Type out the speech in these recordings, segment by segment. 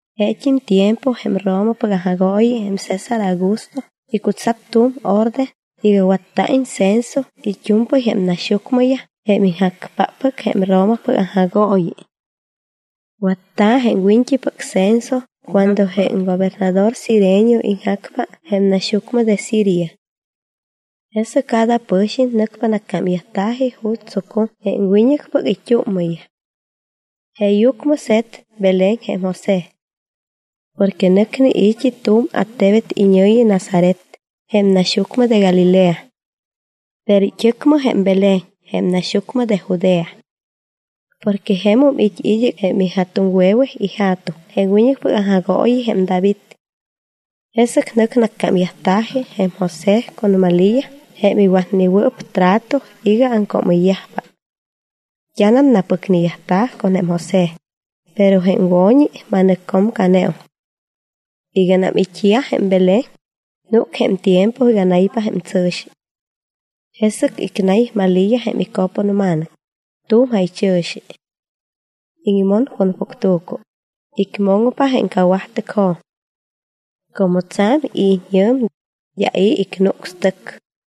Jeet́im tiempo jém Romapɨc aŋjagooyi jém César Augusto icutsat tu̱m orde iga watta̱iñ censo it́u̱mpɨy jém naxyucmɨyaj jém iŋjacpáppɨc jém Romapɨc aŋjagooyi. Watta̱ jém wiñt́ipɨc censo cuando jém gobernador Cirenio iŋjacpa jém naxyucmɨ de Siria. Jesɨc cada pɨ̱xiñ nɨcpa nacámyajta̱ji ju̱t́ tsucum jém wiñɨcpɨc it́úmmɨyaj. Jeeyucmɨ se̱t Belén jém José. Porque nɨcne i̱t́i tu̱m attebet iñɨ̱yi Nazaret jém naxyucmɨ de Galilea. Pero it́ɨcmɨ jém Belén jém naxyucmɨ de Judea. Porque jemum it́ id́ɨc jém ija̱tuŋwe̱we ija̱tuŋ jém wiñɨcpɨc aŋjagooyi jém David. Jesɨc nɨc nacámyajta̱ji jém José con Malía jém iwatnewɨɨp trato iga aŋcoomɨyyajpa. D́anam napɨcneyajta̱ con jém José, pero jém wo̱ñi ma̱nɨccomcaneum. Iganam it́yaj jém Belén, núc jém tiempo iga naypa jém tsɨ̱xi. Jesɨc icnay Malía jém ico̱ponma̱nɨc, tu̱m jaychɨ̱xi. Iŋmon con puctu̱cu, icmoŋpa tu̱m cawajtɨcjo̱m. Como tsa̱m it́ñɨ̱m, d́a i̱ icnucs tɨc.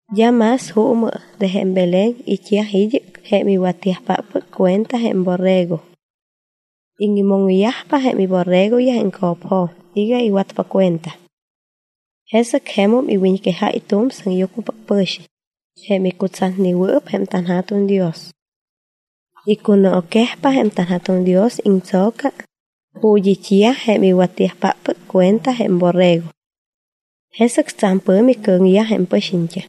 D́a más juumɨ de jém Belén it́yaj id́ɨc jém iwatyajpáppɨc cuenta jém borrego. Iŋmoŋyajpa jém iborregoyaj co̱pjo̱m iga iwatpa cuenta. Jesɨc jemum iwiñquejáy tu̱m sɨŋyucmɨpɨc pɨ̱xiñ jém icutsatnewɨɨp jém tanJa̱tuŋ Dios. Icunooquejpa jém tanJa̱tuŋ Dios icho̱ca ju̱t́ it́yaj jém iwatyajpáppɨc cuenta jém borrego. Jesɨc tsa̱m pɨ̱mi cɨ̱ŋyaj jém pɨxiñt́am.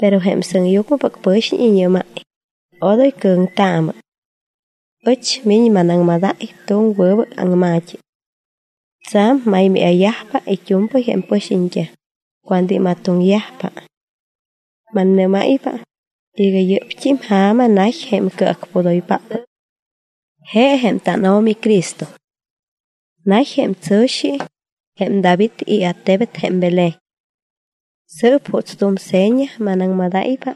Pero jém sɨŋyucmɨpɨc pɨ̱xiñ iñɨ́máy: —¡Odoy cɨ̱ŋtaamɨ! Ɨch miñ manaŋmadáy tu̱m wɨbɨc aŋma̱t́i. Tsa̱m maymáya̱yajpa it́u̱mpɨy jém pɨxiñt́am cuando imatoŋyajpa. Mannɨ́máypa iga yɨ́pt́i ja̱ma nay jém Cɨacpudoypáppɨc. Je jém tánO̱mi CRISTO. Nay jém tsɨ̱xi jém David iattebet jém Belén. Sɨɨp juuts tu̱m seña manaŋmadáypa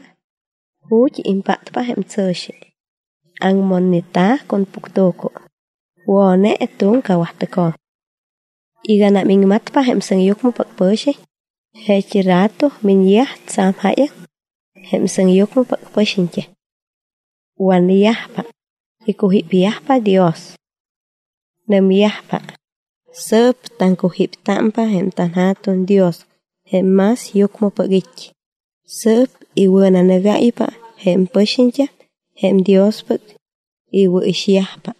ju̱t́ impáttámpa jém tsɨ̱xi; aŋmonneta̱ con puctu̱cu, wo̱ne tu̱m cawajtɨcjo̱m. Iganam iŋmatpa jém sɨŋyucmɨpɨc pɨ̱xiñ, jeet́i rato miñyaj tsa̱m jáyaŋ jém sɨŋyucmɨpɨc pɨxiñt́am. Wanyajpa, icujípyajpa Dios. Nɨmyajpa: Sɨɨp taŋcujíptámpa jém tanJa̱tuŋ Dios jém más yucmɨpɨc it́. Sɨɨp iwɨ̱nanɨgáypa jém pɨxiñt́am jém Diospɨc iwɨ̱ixyajpa.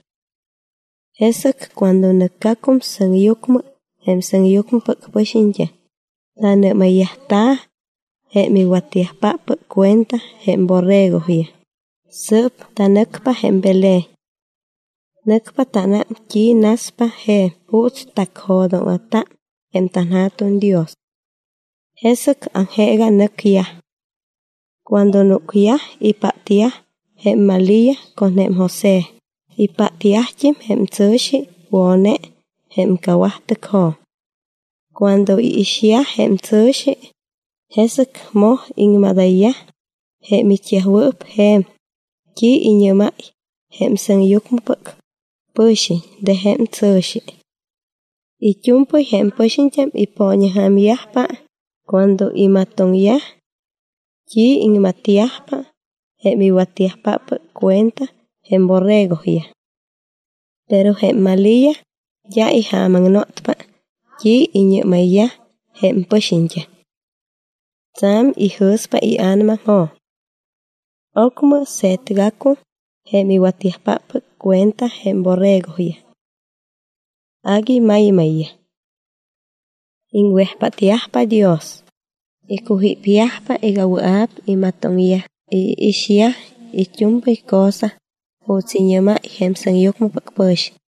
Jesɨc cuando nɨcgacum sɨŋyucmɨ jém sɨŋyucmɨpɨc pɨxiñt́am, nanɨ́mayyajta̱ jém iwatyajpáppɨc cuenta jém borregoyaj: —Sɨɨp tanɨcpa jém Belén. Nɨcpa tánám t́i naspa je̱m juuts tacjo̱dóŋa̱ta jém tanJa̱tuŋ Dios. Jesɨc aŋjeega nɨcyaj. Cuando núcyaj, ipátyaj jém Malía con jém José, ipátyajt́im jém tsɨ̱xi wo̱ne jém cawajtɨcjo̱m. Cuando iixyaj jém tsɨ̱xi, jesɨc moj iŋmadayyaj jém it́yajwɨɨp je̱m t́i iñɨ́máy jém sɨŋyucmɨpɨc pɨ̱xiñ de jém tsɨ̱xi. It́u̱mpɨy jém pɨxiñt́am ipooñaŋja̱myajpa cuando imatoŋyaj t́i iŋmatyajpa jém iwatyajpáppɨc cuenta jém borregoyaj. Pero jém Malía d́a ijaamaŋnotpa t́i iñɨ́mayyaj jém pɨxiñt́am. Tsa̱m ijɨ̱spa ia̱namajo̱m. Ocmɨ se̱tgacum jém iwatyajpáppɨc cuenta jém borregoyaj. Agui maymayyaj. Iŋwejpátyajpa Dios, icujípyajpa iga wɨa̱p imatoŋyaj y iixyaj it́u̱mpɨy cosa juuts iñɨ́máy jém sɨŋyucmɨpɨc pɨ̱xiñ.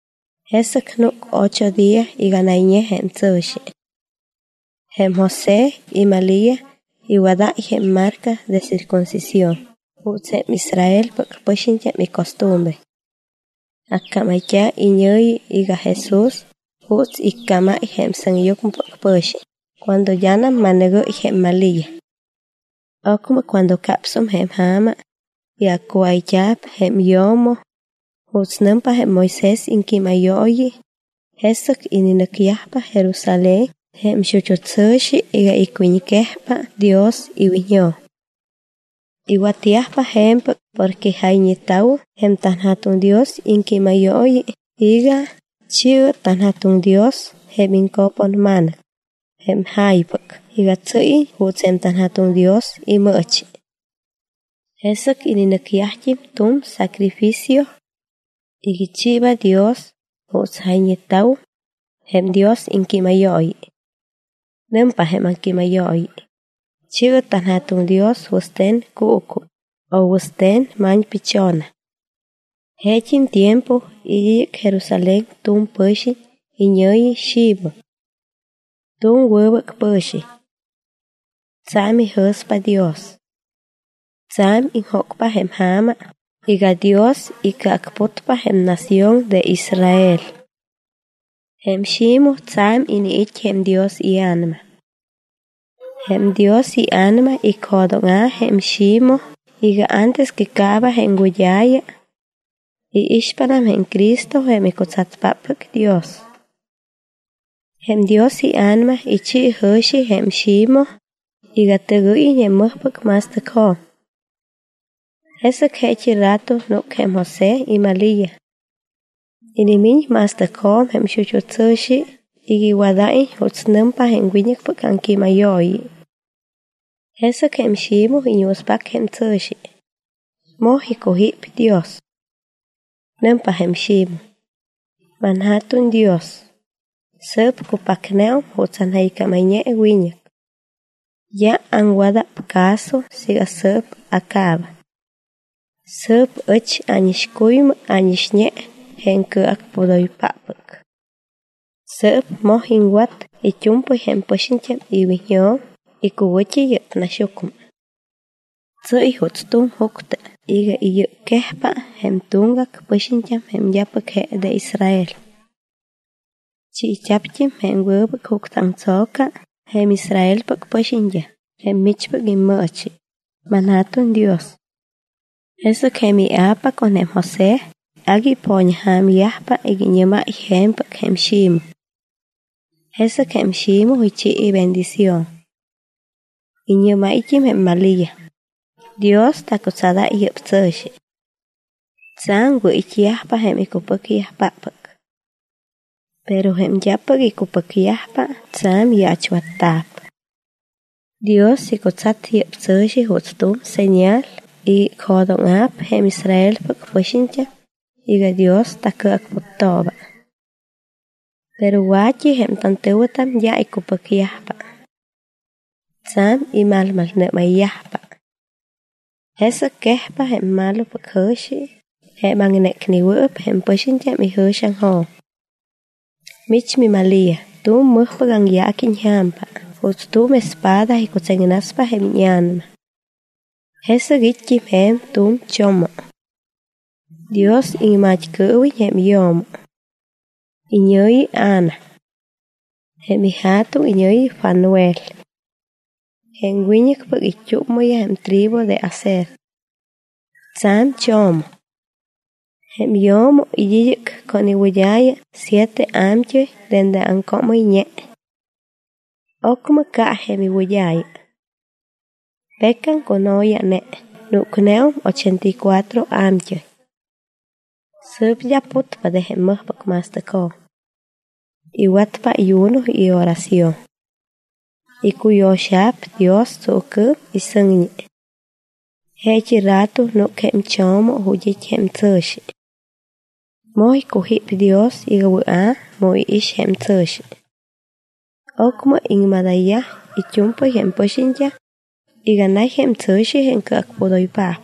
Jesɨc núc ocho día iga nayñe jém tsɨ̱xi. Jém José y Malía iwadáy jém marca de circuncisión juuts jém Israelpɨc pɨxiñt́am icostumbre. Accámayt́a̱ iñɨ̱yi iga JESÚS juuts iccámáy jém sɨŋyucmɨpɨc pɨ̱xiñ cuando d́anam ma̱nɨgɨ́y jém Malía. Ocmɨ cuando capsum jém ja̱ma iga accuáyt́a̱p jém yo̱mo, juuts nɨmpa jém Moisés iŋquímayooyi, jesɨc ininɨcyajpa Jerusalén jém xut́u tsɨ̱xi iga icwiñquejpa Dios iwiñjo̱m. Iwatyajpa je̱mpɨc porque jayñeta̱wum jém tanJa̱tuŋ Dios iŋquímayooyi iga: “Chi̱ɨ tanJa̱tuŋ Dios jém iŋco̱ponma̱nɨc, jém ja̱ypɨc, iga tsɨ́yiñ juuts jém tanJa̱tuŋ Dios imɨɨchi.” Jesɨc ininɨcyajt́im tu̱m sacrificio iga ichiiba Dios juuts jayñeta̱wum jém Dios iŋquímayooyi. Nɨmpa jém aŋquímayooyi: “Chi̱ɨ tanJa̱tuŋ Dios wɨste̱n cuucu o wɨste̱n ma̱ñpichona.” Jesɨc jeet́im tiempo it́ id́ɨc Jerusalén tu̱m pɨ̱xiñ iñɨ̱yi Ximoj. Tu̱m wɨbɨc pɨ̱xiñ. Tsa̱m ijɨ̱spa Dios. Tsa̱m iŋjócpa jém ja̱ma iga Dios icɨacputpa jém nación de Israel. Jém Ximoj tsa̱m iniit́ jém Dios iA̱nama. Jém Dios iA̱nama icjo̱dóŋa̱ jém Ximoj iga antes que caaba jém wɨd́a̱ya, iixpanam jém Cristo jém icutsatpáppɨc Dios. Jém Dios iA̱nama ichi jɨ̱xi jém Ximoj iga tɨgɨ́yiñ jém mɨjpɨc ma̱stɨcjo̱m. Jesɨc jeet́i rato núc jém José y Malía. Inimiñ ma̱stɨcjo̱m jém xut́u tsɨ̱xi iga iwadáyiñ juuts nɨmpa jém wiñɨcpɨc aŋquímayooyi. Jesɨc jém Ximoj iñuuspac jém tsɨ̱xi, moj icujíp Dios. Nɨmpa jém Ximoj: ManJa̱tuŋ Dios, sɨɨp cupacneum juuts anjɨycámayñe wiñɨc. D́a aŋwada̱p caso siiga sɨɨp acaabam. Sɨɨp ɨch ánixcuymɨ ánixñe jém Cɨacpudoypáppɨc. Sɨɨp moj iŋwat it́u̱mpɨy jém pɨxiñt́am iwiñjo̱m icuwɨ̱t́i yɨ́p naxyucmɨ. Tsɨ́y juuts tu̱m juctɨ iga iyɨcquejpa jém tuŋgac pɨxiñt́am jém d́apɨc je de Israel. Chiit́a̱pt́im jém wɨbɨc juctɨaŋtso̱ca jém Israelpɨc pɨxiñt́am jém michpɨc immɨɨchi, manJa̱tuŋ Dios. Jesɨc jém ia̱pa con jém José agui ipooñaŋja̱myajpa iga iñɨ́máy je̱mpɨc jém Ximoj. Jesɨc jém Ximoj ichi ibendición. Iñɨ́máyt́im jém Malía: —Dios tacutsadáy yɨ́p tsɨ̱xi. Tsa̱m wɨ̱it́yajpa jém icupɨcyajpáppɨc. Pero jém d́apɨc icupɨcyajpa tsa̱m yaachwatta̱p. Dios icutsat yɨ́p tsɨ̱xi juuts tu̱m señal iga icjo̱dóŋa̱p jém Israelpɨc pɨxiñt́am iga Dios tacɨacputtooba. Pero wa̱t́i jém tantɨ̱wɨtam d́a icupɨcyajpa. Tsa̱m imalmalnɨ́mayyajpa. Jesɨc quejpa jém malopɨc jɨ̱xi jém aŋnécnewɨɨp jém pɨxiñt́am ijɨ̱xiaŋjo̱m. Mich, miMalía, tu̱m mɨjpɨc aŋyaaqui iñja̱mpa juuts tu̱m espada icutseŋnaspa jém íña̱nama. Jesɨc it́t́im je̱m tu̱m cho̱mo. Dios iŋmat́cɨɨwiñ jém yo̱mo. Iñɨ̱yi Ana. Jém ija̱tuŋ iñɨ̱yi Fanuel. Jém wiñɨcpɨc it́úmmɨyaj jém tribu de Aser. Tsa̱m cho̱mom. Jém yo̱mo it́ id́ɨc con iwɨd́a̱ya siete a̱mt́ɨy dende aŋcoomɨyñe. Ocmɨ ca jém iwɨd́a̱ya. Pecam cuno̱ya̱ne, núcneum ochenta y cuatro a̱mt́ɨy. Sɨɨp d́a putpa de jém mɨjpɨc ma̱stɨcjo̱m. Iwatpa ayuno y oración. Icuyo̱xa̱p Dios tsuucɨɨm y sɨŋñi. Jeet́i rato núc jém cho̱mo ju̱t́ it́ jém tsɨ̱xi. Moj icujíp Dios iga wɨa̱ miix jém tsɨ̱xi. Ocmɨ iŋmadayyaj it́u̱mpɨy jém pɨxiñt́am iga nay jém tsɨ̱xi jém Cɨacpudoypaap.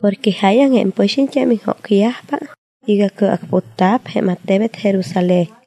Porque jáyaŋ jém pɨxiñt́am iŋjócyajpa iga cɨacputta̱p jém attebet Jerusalén.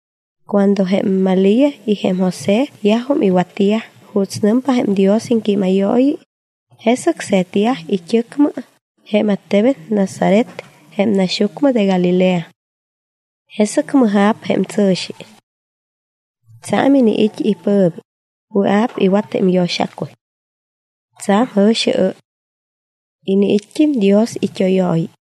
Cuando jém Malía y jém José yajum iwatyaj juuts nɨmpa jém Dios iŋquímayooyi, jesɨc se̱tyaj it́ɨcmɨ jém attebet Nazaret jém naxyucmɨ de Galilea. Jesɨc mɨja̱p jém tsɨ̱xi. Tsa̱m iniit́ ipɨ̱mi, wɨa̱p iwat jém iyo̱xacuy. Tsa̱m jɨ̱xiɨ́y. Iniit́t́im Dios it́óyooyi.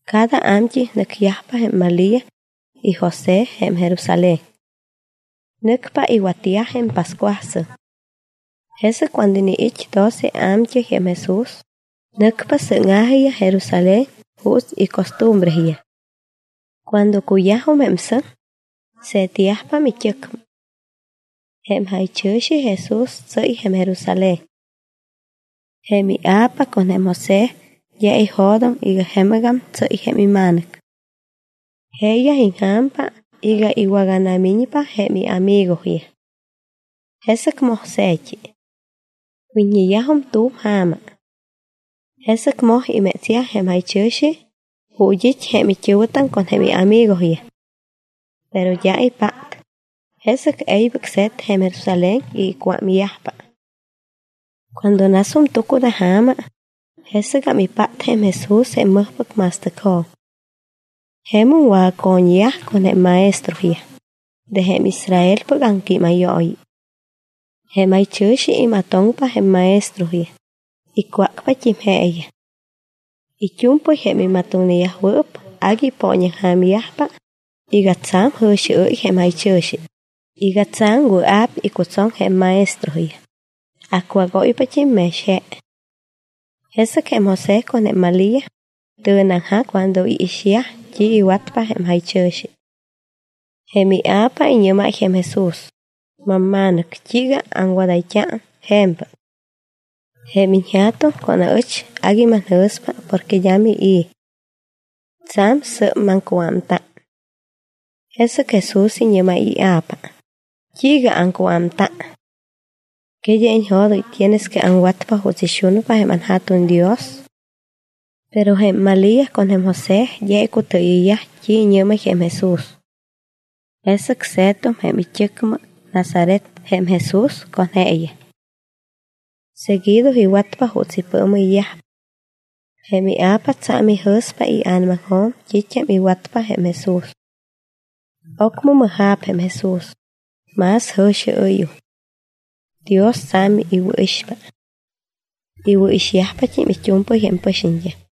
Cada a̱mt́ɨy nɨcyajpa jém Malía y José Jerusalén. Nɨcpa iwatyaj jém pascuasɨŋ. Jesɨc cuando iniit́ doce ia̱mt́ɨy jém Jesús, nɨcpa sɨ́ŋa̱jiyaj Jerusalén juuts icostumbreyaj. Cuando cuyajum jém sɨŋ, se̱tyajpam it́ɨcmɨ. Jém jaychɨ̱xi Jesús tsɨ́y Jerusalén. Jém ia̱pa con jém José d́a ijo̱doŋ iga jemɨgam tsɨ́y jém ima̱nɨc. Jeeyaj iŋja̱mpa iga iwaganamiñpa jém iamigoyaj. Jesɨc moj se̱t́i. Wit́ñeyajum tu̱m ja̱ma. Jesɨc moj imétsyaj jém jaychɨ̱xi ju̱t́ it́ jém it́ɨ̱wɨtam con jém iamigoyaj. Pero d́a ipát, jesɨc e̱ybɨc se̱t Jerusalén iga icuámyajpa. Cuando nasum tucunaja̱ma, jesɨgam ipát jém Jesús jém mɨjpɨc ma̱stɨcjo̱m. Jemum wagaco̱ñyaj con jém maestroyaj de jém Israelpɨc aŋquímayooyi. Jém jaychɨ̱xi imatoŋpa jém maestroyaj, icwácpat́im jeeyaj. It́u̱mpɨy jém imatoŋneyajwɨɨp agui ipooñaŋja̱myajpa iga tsa̱m jɨ̱xiɨ́y jém jaychɨ̱xi iga tsa̱m wɨa̱p icutsoŋ jém maestroyaj, acwágóypat́im mex je. Jesɨc jém José con jém Malía tɨ̱neaŋjac cuando iixyaj t́i iwatpa jém jaychɨ̱xi. Jém ia̱pa iñɨ́máy jém Jesús: —¿Mamma̱nɨc, t́iiga aŋwadayt́a je̱mpɨc? Jém iñja̱tuŋ con aɨch agui manjɨ̱spa porque d́a mii̱. Tsa̱m sɨ́p maŋcuámta. Jesɨc Jesús iñɨ́máy ia̱pa: —¿T́iiga aŋcuámta? ¿Que d́a iñjo̱doŋ iga tienes que aŋwatpa juuts ixunpa anJa̱tuŋ Dios? Pero jém Malía con jém José d́a icutɨɨyɨyyaj t́i iñɨ́máy jém Jesús. Jesɨc se̱tum it́ɨcmɨ Nazaret jém Jesús con jeeyaj. Seguido iwatpa juuts ipɨɨmɨyyajpa. Jém ia̱pa tsa̱m ijɨ̱spa ia̱namaŋjo̱m t́it́am iwatpa jém Jesús. Ocmɨ mɨja̱p jém Jesús, más jɨ̱xiɨ́yum. Dios tsa̱m iwɨ̱ixpa. Iwɨ̱ixyajpat́im it́u̱mpɨy jém pɨxiñt́am.